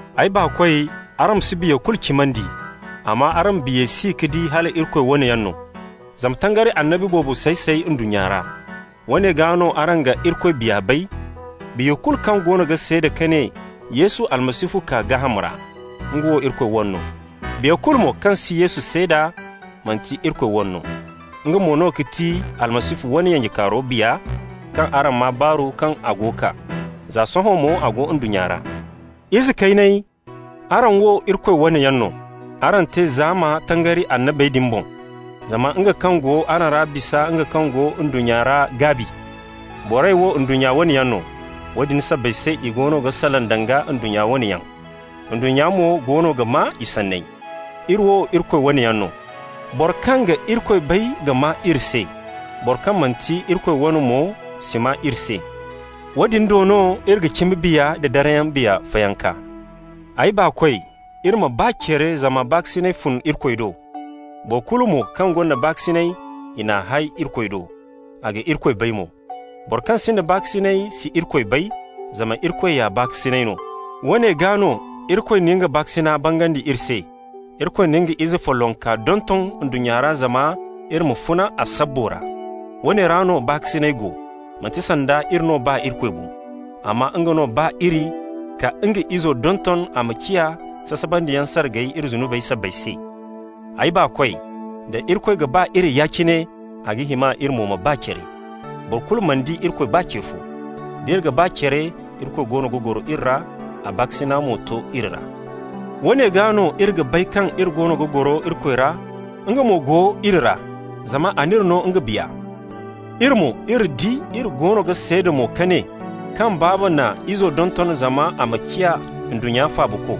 Ay baakoy, araŋ ma si biya kulu cimandi, amma araŋ ma biyey si ka di hala Irikoy wane yaŋ no. Zama tangari annabi boobo say-say ndunnya ra. Woone gaa no araŋ ga Irikoy Biya bay: biya kulu kaŋ goono ga seeda ka ne Yesu Almasihu kaa gaaham ra, nga wo Irikoy wane no. Biya kulu mo kaŋ si Yesu seeda, manti Irikoy wane no. Nga mo no ga ti Almasihu wane yanjekaaro biya kaŋ araŋ maa baaru kaŋ a go kaa. Za sohõ mo a go ndunnya ra. Ize kayney, araŋ wo Irikoy wane yaŋ no. Araŋ te zaama tangari annabey din boŋ. Zama nga kaŋ go araŋ ra bisa nga kaŋ go ndunnya ra gaabi. Borey wo ndunnya wane yaŋ no. Woodin sabbay se i goono ga salaŋ danga ndunnya wane yaŋ. Ndunnya mo goono ga maa i sanney. Iri wo Irikoy wane yaŋ no. Boro kaŋ ga Irikoy bay ga maa iri se. Boro kaŋ manti Irikoy wane mo si maa iri se. Woodin do no iri ga cimi biya da darayyaŋ biya fayanka. Ay baakoy, iri ma ba care zama baakasinay fun Irikoy do. Boro kulu mo kaŋ gonda baakasinay, i n'a hay Irikoy do, a ga Irikoy bay mo. Boro kaŋ sinda baakasinay si Irikoy bay, zama Irikoy ya baakasinay no. Woone gaa no Irikoy na nga baakasina bangandi iri se: Irikoy na nga ize follonka donton ndunnya ra zama iri ma funa a sabbo ra. Woone ra no baakasinay go: manti sanda iri no ba Irikoy bo, amma nga no ba iri ka nga Izo donton a ma ciya sasabandiyaŋ sargay iri zunubey sabbay se. Ay baakoy, da Irikoy ga ba iri yaadin cine, a ga hima iri mo ma ba care. Boro kulu mana di Irikoy baa ce fo. D'iri ga ba care, Irikoy goono ga goro iri ra, a baakasina mo to iri ra. Woone gaa no iri ga bay kaŋ iri goono ga goro Irikoy ra, nga mo go iri ra, zama a n'iri no nga Biya. Iri mo, iri di, iri goono ga seeda mo ka ne kaŋ Baaba na Izo donton zama a ma ciya ndunnya Faabako.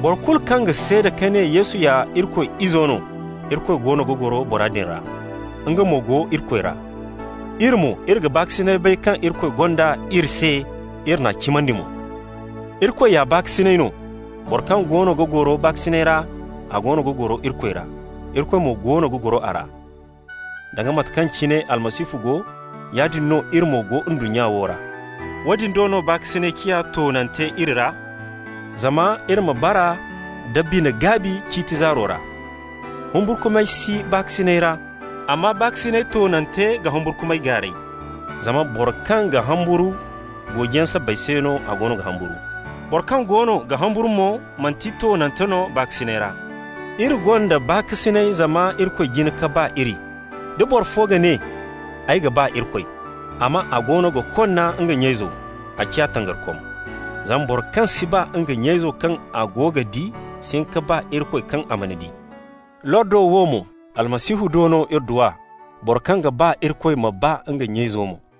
Boro kulu kaŋ ga seeda ka ne Yesu ya Irikoy Izo no, Irikoy goono ga goro bora din ra, nga mo go Irikoy ra. Iri mo, iri ga baakasina bay kaŋ Irikoy gonda iri se, iri n'a cimandi mo. Irikoy ya baakasinay no. Boro kaŋ goono ga goro baakasinay ra, a goono ga goro Irikoy ra. Irikoy mo goono ga goro a ra. Danga mate kaŋ cine Almasihu go, yaadin no iri mo go ndunnyo wo ra. Woodin do no baakasinay ciya toonante iri ra, zama iri ma bara nda bine-gaabi ciiti zaaro ra. Humburkumay si baakasinay ra, amma baakasinay toonante ga humburkumay gaaray, zama boro kaŋ ga humburu, goojiyaŋ sabbay se no a goono ga humburu. Boro kaŋ goono ga humburu mo, manti toonante no baakasinay ra. Iri gonda baakasinay zama Irikoy jin ka ba iri. Da boro fo ga ne: «Ay ga ba Irikoy,» amma a goono ga konna nga nya-izo, a ciya tangarikom. Zama boro kaŋ si ba nga nya-izo kaŋ a go ga di si hin ka ba Irikoy kaŋ a mana di. Lordo wo mo, Almasihu do no iri du a: boro kaŋ ga ba Irikoy ma ba nga nya-izo mo.